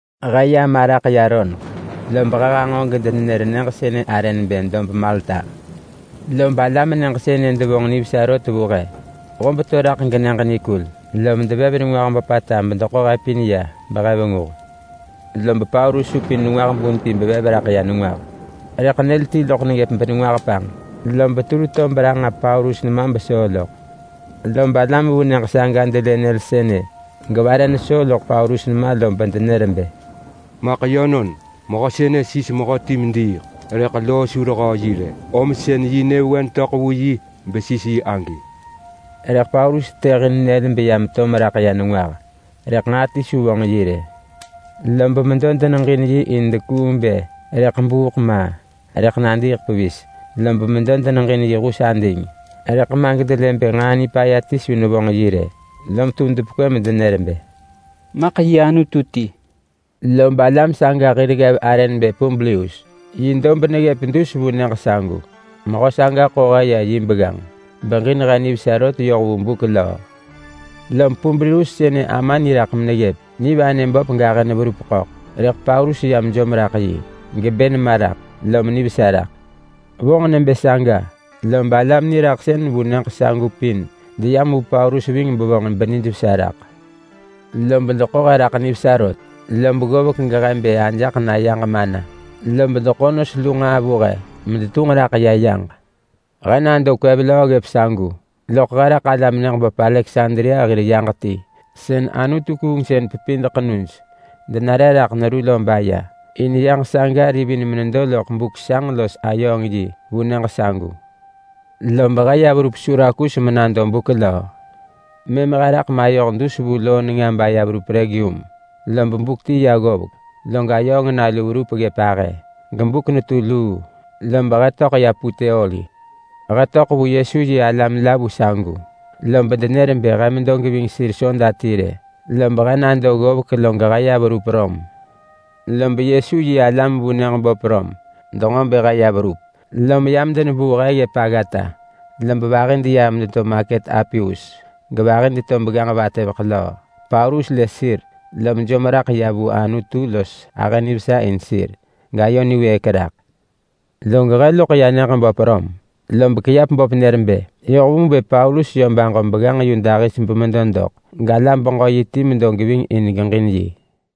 He ya maraḳ ya roneḳ, lob he hanġo gedenenër nyëġ sënë arë nebë dob Malta. Lob alam nyëġ sënë devonġ nivesa rot vu he. Hob to raḳ genyëġ nikul lom devev nengwah böpata bedeḳo he pin ya behe venguh. Lob Paulus supin nengwah bun ti bevev raḳ ya nengwah, rëḳ nyël ti loḳ neggëp benengwah panġ, lob tur to beranġa Paulus nema besoo loḳ. Lob alam vu nyëġ saga delë nyël sënë gevare nesoo loḳ Paulus nema lob denër bë, “Maḳ yönon, mehö sënë sis mehöti mediiḳ, rëḳ loo su rehöö yi rë, om sën yi nyëvewen töḳ vu yi besis yi agi.” Rëḳ Paulus tetëhin nyël beya meto meraḳ ya nengwah rëḳ nġaa ti su vonġ yi rë. Lob medo deneġin yi in dekuung bë rëḳ buuk ma, rëḳ nadiiḳ pevis. Lob medo deneġin yi hus ading, rëḳ ma gedelë bë nġaa nipaya ti su nevonġ yi rë, lom tum depekwë medenër bë, “Maḳ yi anutu ti!” Lob alam saga hir ggev arë nebë Publius, yi dob neggëp dus vu nyëġ sagu. Mehö saga ḳo he ya yi begganġ, beġin he nivesa rot yoh vu buk löö. Lob Publius sënë ama niraḳ meneggëp. Nivanë böp gahë neverup ḳöḳ, rëḳ Paulus ya mejom raḳ yi, gebë nema raḳ lom vesa loḳ. Vonġ nebë saga, lob alam niraḳ sën vu nyëġ sagu pin deyam vu Paulus ving bevonġ benijvesa raḳ ggökin. Lob deḳo he raḳ nivesa rot. Lob ggovek gehe bë ajaḳ na yaġ mana, lob deḳo nos lu nġaa vu he medetunġ raḳ ya yaġ. He nado kwev löö ggëp sagu, loḳ he raḳ alam nyëġ böp Aleksandria hir yaġ ti sën anutu-kuungsën-pepid ḳenuj denare raḳ neru lo baya. In yaġ saga rivin menedo loḳ buk sanġ los ayööng yi vu nyëġ sagu. Lob he ya verup Surakus menado buk löö. Mëm he raḳ mayoh dus vu loo nenga baya verup Regium. Lob buk ti ya ggovek, log ayööng nalu verup ggëp ahë gebuk netu luu lob he töḳ ya Puteoli. He töḳ vu Yesu-yi-alam la vu sagu, lob denër bë he medo geving sir soda ti rë. Lob he nado ggovek log he ya verup Rom. Lob Yesu-yi-alam vu nyëġ böp Rom denġo bë he ya verup, lom yam denebuu he ggëp aggata. Lob vahi deyam medeto maket Apius, gevahi deto Begganġ-vatëveḳ-löö. Paulus lë sir, lom jom raḳ ya vu Anutu los ahë nivesa in sir, gayo niwëëk raḳ. Log he loḳ ya nyëġ böp Rom, lob kiap böp nër bë yoh vu bë Paulus yö baġo begganġ yu dahis bemedo doḳ, galam-beġö-yi ti medo geving in geġin yi.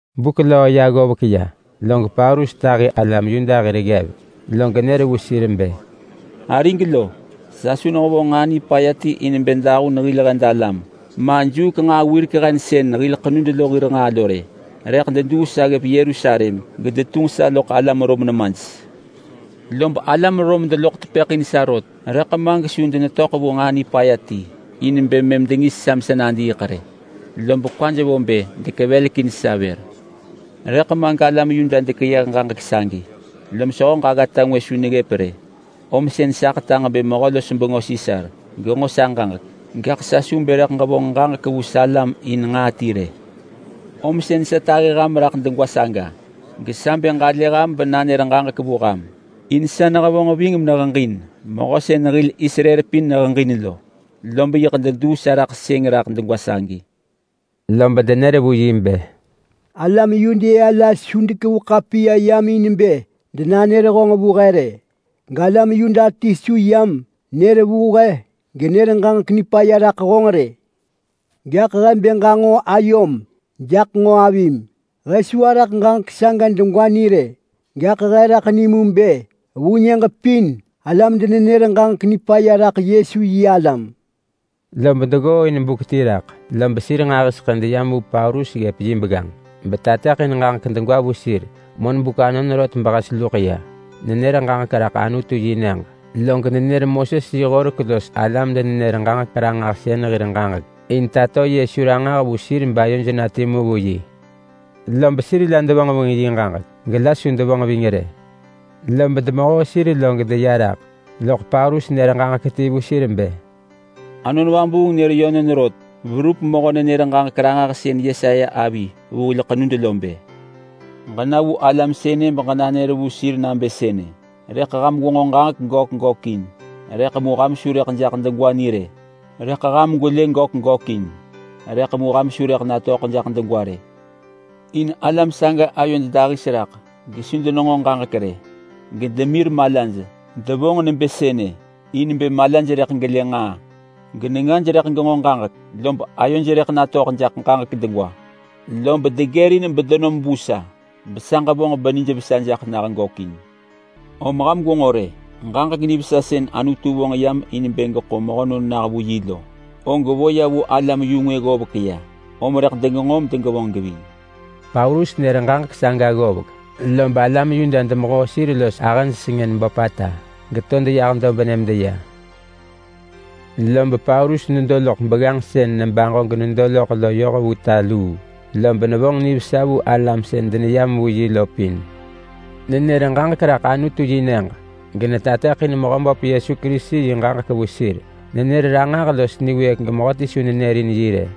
Buk löö ya ggovek ya log Paulus tahi alam Yuda hir ggev, log nër vu sir bë, “Arig lo, sa su nehevonġ nġaa nipaya ti in bë dahun hil hed alam ma, juuk nġaa wirek hen sën hil ḳenud lo hir nġaa lo rë. Rëḳ deduu sa ggëp Yerusalem gedetunġ sa loḳ alam Rom nemaj. Lob alam Rom deloḳ tepëḳ in sa rot, rëḳ ma gesu denetöḳ vu nġaa nipaya ti in bë mëm dengis sa mesa nadiiḳ rë, lob kwaj vo bë dekevelekin sa vër. Rëḳ ma, galam Yuda dekeyëh ġaġek sagi, lom sehöġ aggata ngwë su neggëp rë, om sën sa ḳetaġ bë mehö-los-bengö Sisar genġo sa ġaġek. Gaḳ sa su bë rëḳ ġevonġ ġaġek vu salam in nġaa ti rë. Om sën sa tahi ham raḳ degwa saga, gesa bë ġalë ham benanër ġaġek vu ham, in sa nehevonġ ving meneheġin mehö sën hil Israel pin neheġin lo. Lob yiḳ deduu sa raḳ sëng raḳ degwa sagi.” Lob denër vu yi bë, “Alam Yudea la su dekevu ḳapiya yam in bë denanër honġ vu he rë. Galam Yuda ti su yam nër vu he genër ġaġek nipaya raḳ honġ rë. Gaḳ he bë ġanġo ayom jaḳ nġo avim. He su araḳ ġaġek saga degwa ni rë. Gaḳ he raḳ ni mu bë vu nyëġ pin alam denenër ġaġek nipaya raḳ Yesu-yi-alam.” Lob deggooin buk ti raḳ, lob sir nġahiseḳë deyam vu Paulus ggëp yi begganġ betateḳin ġaġek degwa vu sir monbuk anon rot behes luḳ ya. Nenër ġaġek raḳ Anutu-yi-nyëġ, log nenër Moses yi horek los alam-denenër-ġaġek-ranġahsën hir ġaġek in tato Yesu ranġah vu sir bayoj na timu vu yi. Lob sir la devonġ ving yi ġaġek, gela su devonġ ving rë. Lob demehoo sir log deya raḳ, loḳ Paulus nër ġaġek ti vu sir bë, “Anon Vabuung nër yönon rot beverup mehö-nenër-ġaġek-ranġahsën Yesaya avi vu hil ḳenud lo bë: ‘Ġena vu alam sënë beġenanër vu sir nabë sënë: “Rëḳ ham gwenġo ġaġek gök gökin, rëḳ mu ham su rëḳ jaḳ degwa ni rë. Rëḳ ham gwelë gök gökin, rëḳ mu ham su rëḳ natöḳ jaḳ degwa rë.” In alam saga ayoj dahis raḳ, gesu denenġo ġaġek rë, gedemir malaj. Devonġ nebë sënë in bë malaj rëḳ gelë nġaa, genengaj rëḳ genġo ġaġek, lob ayoj rëḳ natöḳ jaḳ ġaġek degwa, lob degërin bedenom vu sa besa ġevonġ benijvesa jaḳ nah gökin.’ Om ham gwenġo rë, ġaġek nivesa sën Anutu vonġ yam in bë geḳo mehönon nah vu yi lo, og vo ya vu alam-yu-ngwë ggovek ya, om rëḳ degenġo medegevonġ geving.” Paulus nër ġaġek saga ggovek, lob alam Yuda demehoo sir los ahëj sengën böpata geto deyah dobnë medeya. Lob Paulus nedo loḳ begganġ sën nebaġo genedo loḳ lo yoh vu ta luu, lob nevonġ nivesa vu alam sën deneyam vu yi lo pin. Nenër ġaġek raḳ Anutu-yi-nyëġ, genetateḳin Mehöböp Yesu Kerisi yi ġaġek vu sir. Nenër ranġah los niwëëk gemehöti su nërin yi rë.